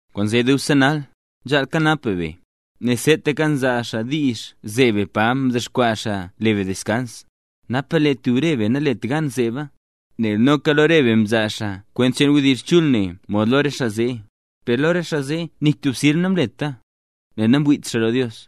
Kwaanzee dubse nal, nzhaal kanap be be, nel seetaka nzaa xaa diizh zeeb be pa mdexkwaa xaa le be deskans, napa lee tub re be nalet gan zeeba. Nel noka lo re be mzaa xaa kwent cheen wdizh chul ne mod lo re xaa zee; per lo re xaa zee nik tub sirb namleta, nel namwiit xaa lo Dios.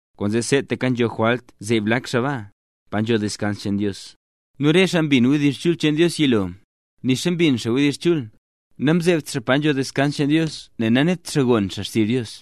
Kwaanzee seetaka nzho jwalt zeeb lak xaa baa, pa nzho deskans cheen Dios. Nu re xaa mbin wdizh chul cheen Dios yilo, nixa mbin xaa wdizh chul, namzeebt xaa pa nzho deskans cheen Dios nel nanet xaa gon xaa xtizh Dios.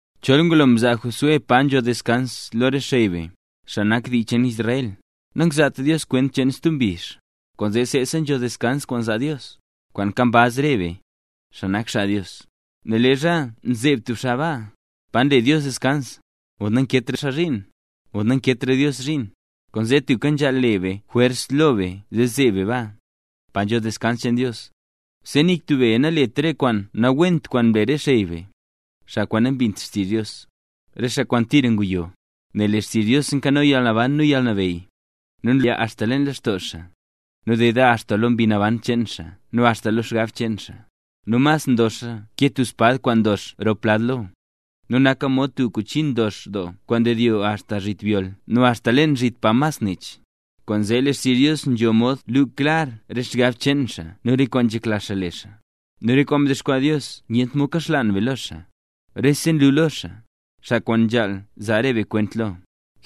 Chol ngulola mzaa Josué pa nzho deskans lo re xey be, xaa nak dii cheen Israel, nangzaat Dios kwent cheen stub mbizh. Kwaanzee seesa nzho deskans kwaan zaa Dios, kwaan nkambaz re be, xaa nak xaa Dios; nel leezha nzeeb tub xaa baa, pa nle Dios deskans, nakeetra xaa zhiin, mod namkeetra Dios zhiin. Kwaanzee tubka nzhaal le be jwers lo be zee zeeb be baa, pa nzho deskans cheen Dios; zee nik tub be nalet re kwaan nawent kwaan mle re xey be, xaa kwaan nambint xtizh Dios, re xaa kwaan tira nguyo. Nel lee xtizh Dios nkano yalnaban nu yalnabeyy, nu nlaya axta leen lextoo xaa, nu deda axta lo mbi naban cheen xaa nu axta lo xgab cheen xaa. Nu mas ndoxa ke tub espad kwaan ndox rop lad lo, nu naka mod tub kuchi ndox doo kwaan ndedyo axta zhit byol nu axta leen zhit pa mas nech. Kwaanzee lee xtizh Dios nzho mod lu klar re xgab cheen xaa nu re kwaan nzhekla xaa le xaa. Nu rese kwaan mdexkwaa Dios nyent mod kaxlaan be lo xaa; rese nlu lo xaa, xaa kwaan nzhaal zaa re be kwent lo.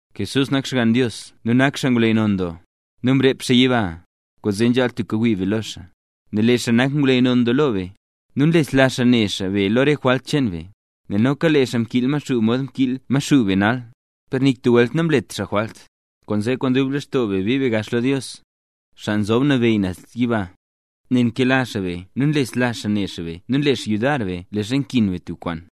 Jesús nak Xgann Dios nu nak xaa ngwleyy non doo lo be, nu mrep xaa yiba. Kwaanzee nzhaal tubka wii be lo xaa. Nel lee xaa nak ngwleyy non doo lo be, nu nlesla xaa ne xaa be lo re jwalt cheen be; nel noka lee xaa mkiil Maxuu mod nkiil Maxuu be nal, per nik tub welt namlet xaa jwalt. Kwaanzee kwaan dub lextoo be bii be gax lo Dios, xaa nzob nabeyy naz yiba, nel nkela xaa be nu nlesla xaa ne xaa be nu nle xaa yudar be leezha nkin be tub kwaan.